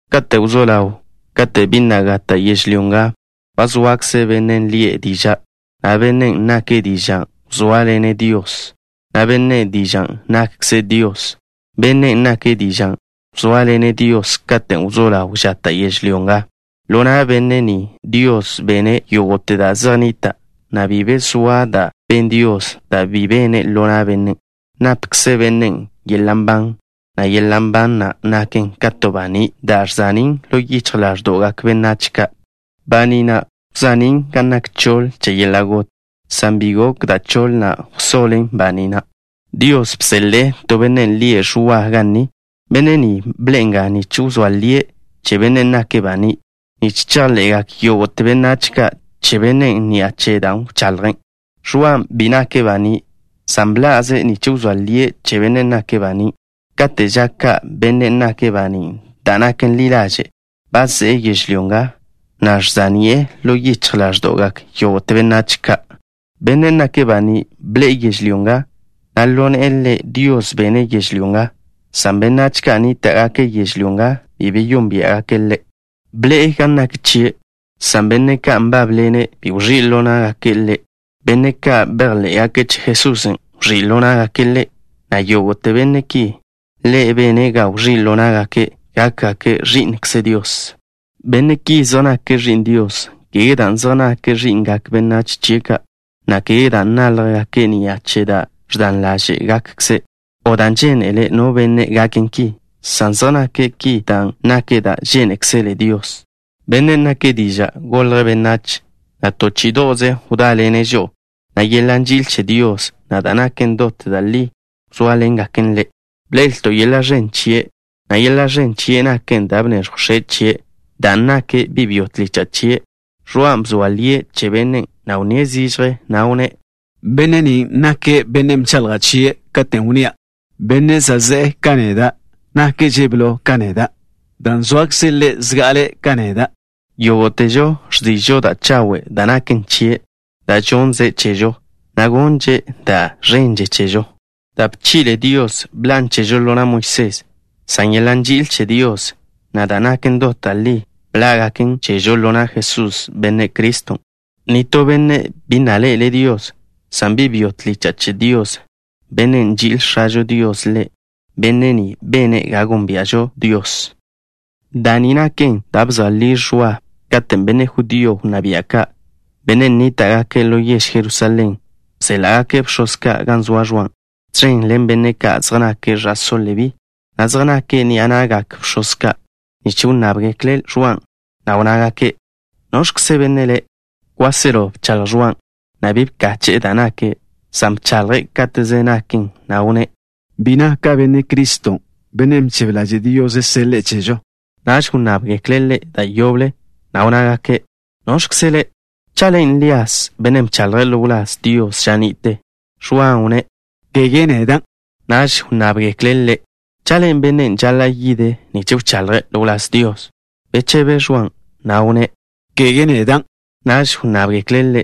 Kate' wzó ḻaw, kate' bi na' gata' yežlyó nga, ba zoakze Bennen' lie' Diža', na' Bennen' nake' Diža' wzóaḻene' Dios, na' Benne' Dižan' nakkze' Dios. Bennen' nake' Diža' wzóaḻene' Dios katen' wzó ḻaw žata' yežlyó nga. Ḻo na' Benne' ni, Dios bene' yógo'te da' zej nnita', na' bi be zoa da' ben Dios da' bi bene' ḻo na' Bennen'. Napkze Bennen' yeḻa' nban, na' yeḻa' nban na' naken ka to baní' da' ẕza'nín' ḻo yichj ḻáẕdo'gak benách ka'. Baní' na' wza'nín' gan nak choḻ che yeḻa' got, san bi gok da' choḻ na' wsoḻen baní' na'. Dios bseḻe'e to benne' lie' Ẕwa ga ni. Benne' ni bḻe'e nga nich wzóa lie' che Bennen' nake' baní', nich chejḻe'gak yógo'te benách ka' che Bennen' ni'a che dan' wchaḻje'. Ẕwan' bi nake' banín', san bḻa'ze' nich wzóa lie' che Bennen' nake' baní'. Kate' ža ka' Bennen' nake' baní' da' naken ḻi ḻaže' ba ze'e yežlyó nga, na' ẕza'ni'e ḻo yichj ḻáẕdo'gak yógo'te benách ka'. Bennen' nake' baní' bḻe'e yežlyó nga, na' ḻo ne'e Ḻe' Dios bene' yežlyó nga, san benách ka' nníta'gake' yežlyó nga bi beyónbia'gake' Ḻe'. Bḻe'e gan nak chie', san benne' ka' nbábḻene' bi wẕí' ḻo ná'gake' Ḻe'. Benne' ka' bejḻé'gake' che Jesusen' wẕí' ḻo ná'gake' Ḻe', na' yógo'te benne' ki, Ḻe' bene' ga wẕí' ḻo ná'gake' gákgake' ẕi'nkze Dios. Benne' ki zej nake' ẕi'n Dios, kege dan' zej nake' ẕi'ngak benách chie' ka', na' kege dan' náljgake' ni'a che da' ẕdan ḻáže'gakkze', o dan' žénele no benne' gaken ki, san zej nake' ki dan' naken da' žénekzele Dios. Bennen' nake' Diža' golje' benách, na' to chí'i'do'ze wdáḻene' žo'o, na' yeḻa' nži'il che Dios, na' da' naken dot da' li wzóaḻengaken Ḻe'. Bḻe'elto' yeḻa' ẕen chie', na' yeḻa' ẕen chien' naken da' bneẕjw X̱e' chie' dan' nake' bi' byo tlicha' chie'. Ẕwan' bzoa lie' che Bennen'. Wnníe' zižje, na' wnné': —Benne' ni nake' Bennen' bchaḻja' chie' katen' wnnía': “Benne' za' ze'e ka neda' nakže' blo ka neda', dan' zoakze' Ḻe' zga'ale' ka neda'.” Yógo'težo ẕzi'žo da' chawe' da' naken chie', da' žonnze' chežo, na' gonnže' da' ẕenže chežo. Da' bchi'le Dios bḻan' chežo ḻo na' Moisés, san yeḻa' nži'il che Dios, na' da' naken dot da' li bḻá'gaken chežo ḻo na' Jesús, Benne' Criston'. Nitó benne' bi na' ḻe'ele' Dios, san bi' byo tlicha' che Dios, Bennen' nži'il X̱ažo Dios Ḻe', Benne' ni bene' ga nónbia'žo Dios. Da' ni naken da' bzoa li Ẕwa, katen' benne' judío wnná bia' ka', benne' nníta'gake' ḻo yež Jerusalén, bséḻa'gake' bx̱oz ka' gan zoa Ẕwan', tẕen ḻen benne' ka' zej nake' ẕa'só Lebí, benne' ka' zej nake' ni'a na'gak bx̱oz ka', nich nnábgekle' Ẕwan', na' wnnágake': —¿Noẕkze benne' le'? Kwáselo bchaḻj Ẕwan', na' bi bkache'e da' nake', san bchaḻje' káteze naken, na' wnné': —Bi naka' Benne' Criston', Bennen' bchebe ḻaže' Dios seḻe'e chežo. Naž wnnábgekle' ḻe' da' yoble, na' wnnágake': —¿Noẕkze le'? ¿Cha' len' Lías, bennen' bchaḻje' ḻo wláz Dios ža ni'te? Ẕwan' wnné': —Kege nedan'. Naž wnnábgekle' ḻe': —¿Cha' len' bennen' žaḻa' yide' nich wchaḻje' ḻo wláz Dios? Bechebe Ẕwan', na' wnné': —Kege nedan'. Naž wnnábgekle' ḻe':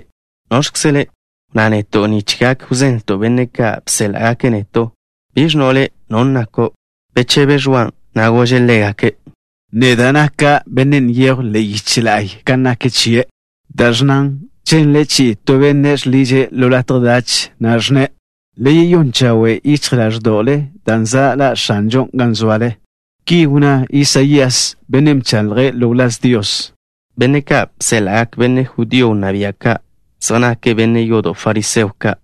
—¿Noẕkze le'? Wnná neto' nich gak wzenlto' benne' ka' bséḻa'gake' neto'. ¿Biẕ ẕnno' le' non' nako'? Bechebe Ẕwan', na' gože' ḻégake': —Neda' naka' bennen', nyejw ḻe'e yiche la'y ka nak chie', dan' ẕnnan: “Ženle chi'i to benne' žḻiže' ḻo latje dach, ẕnne': Le yeyón chawe' yichj ḻáẕdo'le dan' za' ḻa' X̱anžon' gan zoale.” Ki wnná Isaías, bennen' bchaḻje' ḻo wláz Dios. Benne' ka' bséḻa'gak benne' judío wnná bia' ka' zej nake' benne' yodo' fariseo ka'.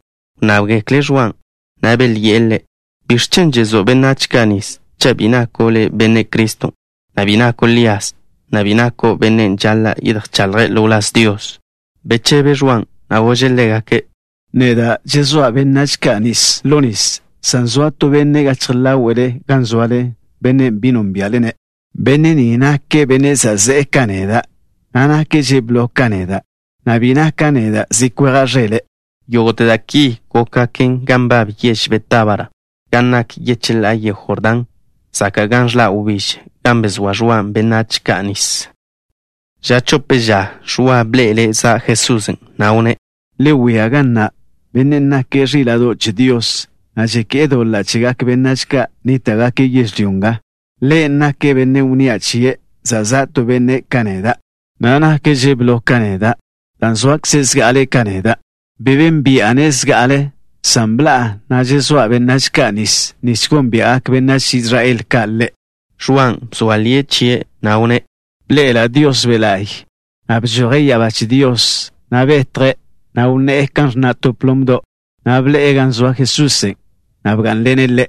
Wnnábgekle' Ẕwan', na' belyi'e ḻe': —¿Biẕ chen' žezó' benách ka' nis cha' bi nako' le' Benne' Criston', na' bi nako' Lías, na' bi nako' bennen' žaḻa' yedjchaḻje' ḻo wláz Dios? Bechebe Ẕwan', na' gože' ḻégake': —Neda' žezóa' benách ka' nis ḻo nis, san zoa to benne' gachje ḻáwe'le gan zoale, bennen' bi nónbia'le-ne'. Benne' ni nake' Bennen' za' ze'e ka neda', na' nakže' blo ka neda', na' bi naka' neda' zi kweja' ẕele'. Yógo'te da' ki gókgaken gan nbab yež Betábara, gan nak yecheḻá'a yego Jordán, zaka' gan ẕḻa' wbíž, gan bezóa Ẕwan' benách ka' nis. Ža chope ža Ẕwa bḻe'ele' za' Jesusen', na' wnné': —Le wia ga na'. Bennen' nake' ẕíla'do' che Dios, na' žeké'e doḻa' chegak benách ka' nníta'gake' yežlyó nga. Ḻe' nake' Bennen' wnnía' chie': “Za' za' to Benne' ka neda', na' nakže' blo ka neda', dan' zoakze' zga'ale' ka neda'.” Bi bénbi'a-ne' zga'ale, san bḻa'a, na' žezóa' benách ka' nis nich gónbia'gak benách Israel ka' Ḻe'. Ẕwan' bzoa lie' chie', na' wnné': —Bḻe'ela' Dios Be' La'y, bžoje' ya'abá che Dios, na' betje', na' wnné'e kan ẕnna' to plomdo'. Bḻe'e gan zoa Jesusen', na' bgá'nḻene' Ḻe'.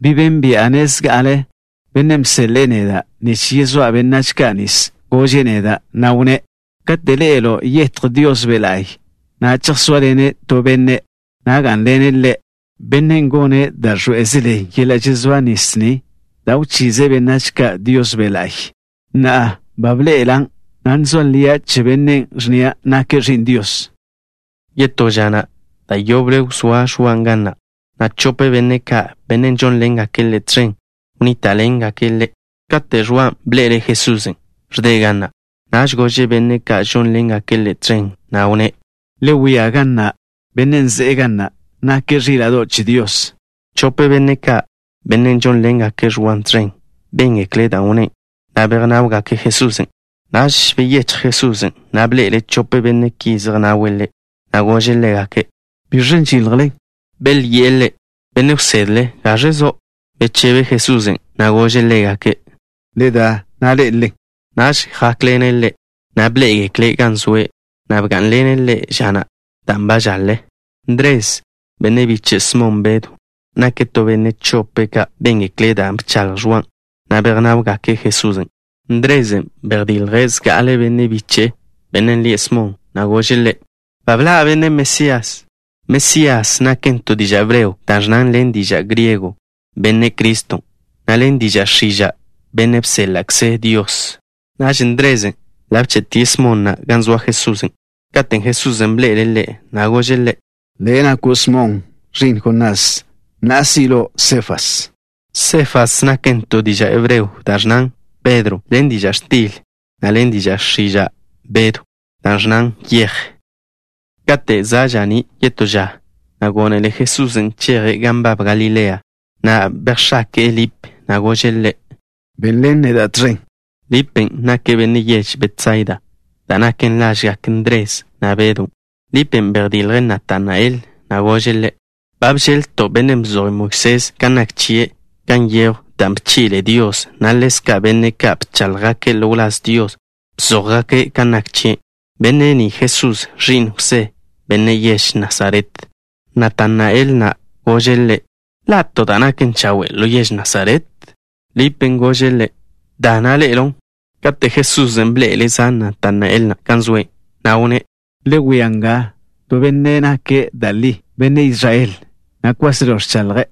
Bi bénbi'a-ne' zga'ale. Bennen' bseḻe'e neda' nich yezóa' benách ka' nis gože' neda', na' wnné': “Kate' ḻe'elo' yetj Dios Be' La'y, chejsóaḻene' to Benne', na' gá'nḻene' Ḻe', Bennen' gone' da' ẕḻoé'ezele yeḻa' žezóa nis ni, dan' wchize' benách ka' Dios Be' La'y.” Na'a, ba bḻe'elan', na' ẕzoa lia' che Bennen', ẕnnia' nake' Ẕi'n Dios. Yetó ža na', da' yoble wzóa Ẕwa ga na', na' chope benne' ka', benne' žónḻengake' ḻe' tẕen, wnníta'ḻengake' ḻe'. Kate' Ẕwan' bḻe'ele' Jesusen', ẕde' ga na', gože' benne' ka' žónḻengake' ḻe' tẕen, na' wnné': —Le wia ga na'. Bennen' ze'e ga na' nake' ẕíla'do' che Dios. Chope benne' ka', benne' žónḻengake' Ẕwan' tẕen, béngekle' dan' wnné', na' bejnáwgake' Jesusen'. Naž beyéchj Jesusen', na' bḻe'ele' chope benne' ki zej nawe' Ḻe', na' gože' ḻégake': —¿Biẕen' žiljle? Belyi'e Ḻe': —Benne' wsedle, ¿gaẕe zo'? Bechebe Jesusen', na' gože' ḻégake': —Le da, na' ḻé'elelen. Naž jákḻene' Ḻe', na' bḻé'egekle' gan zoe', na' bgá'nḻene' Ḻe' ža na', dan' ba žaḻe. Ndres, benne' biche' Smon Bedw, nake' to benne' chope' ka' béngekle' da' bchaḻj Ẕwan', na' bejnáwgake' Jesusen'. Ndrezen' bejdilje' zga'ale benne' biche'e, bennen' lie' Smon, na' gože' ḻe': —Ba bḻa' Benne' Mesías. Mesías naken to diža' hebreo da' ẕnnan ḻen diža' griego: “Benne' Criston'” na' ḻen diža' x̱iža': “Benne' bséḻa'kze Dios.” Naž Ndrezen' ḻa' bche'tie' Smon na' gan zoa Jesusen'. Katen' Jesusen' bḻe'ele' ḻe', gože' ḻe': —Le' nako' Smon, ẕi'n Jonás. Na'a, si' lo' Sefas. Sefas naken to diža' hebreo da' ẕnnan: “Pedro” ḻen diža' x̱til, na' ḻen diža' x̱iža': “Bedw” da' ẕnnan: “Yej.” Kate' za' ža'ní' yetó ža, gónele Jesusen' cheje' gan nbab Galilea. Bejx̱ake'e Lip, na' gože' ḻe': —Benḻen neda' tẕen. Lipen' nake' benne' yež Betsaida, da' naken lažgak Ndres, na' Bedon'. Lipen' bejdilje' Natanael, na' gože' ḻe': —Ba bžeḻ-lto' Bennen' bzoj Moisés kan nak chie' gan nyejw da' bchi'le Dios, na' ḻezka' benne' ka' bcháḻjgake' ḻo wláz Dios bzójgake' kan nak chie'. Benne' ni Jesús, ẕi'n Jwsé, benne' yež Nasaret. Natanael na' gože' ḻe': —¿Ḻa' to da' naken chawe' ḻo yež Nasaret? Lipen' gože' ḻe': —Da, na' ḻe'elon'. Kate' Jesusen' bḻe'ele' za' Natanael na' gan zoe', wnné': —Le wia nga to benne' nake' da' li benne' Israel, na' kwáselo ẕchaḻje'.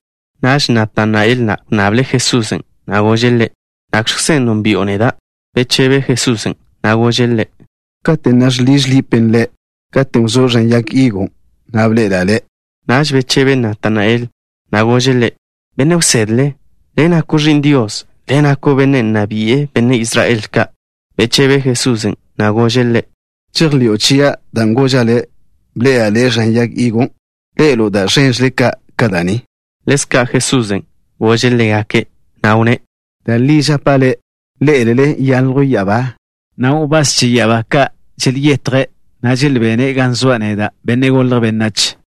Naž Natanael na' wnnable' Jesusen', na' gože' Ḻe': —¿Nakẕkzen' nónbi'o neda'? Bechebe Jesusen', na' gože' ḻe': —Kate' ne žḻiž Lipen' le', katen' wzó' ẕan yag higon', bḻe'ela' le'. Naž bechebe Natanael, na' gože' Ḻe': —¡Benne' wsedle, Le' nako' Ẕi'n Dios! ¡Le' nako' Benne' Nna Bi'e Benne' Israel Ka'! Bechebe Jesusen', na' gože' ḻe': —¿Žejḻi'o chia', dan' goža' le': “Bḻe'ela' le' ẕan yag higon'”? Ḻe'elo' da' ẕénḻe'eže ka' ka da' ni. Ḻezka' Jesusen' gože' ḻégake', na' wnné': —Da' li žapa' ḻe'e, ḻé'elele nyaljw ya'abá, na' wbás che ya'abá ka' želyetje', na' želbene' gan zoa' neda', Benne' Golje' Benách.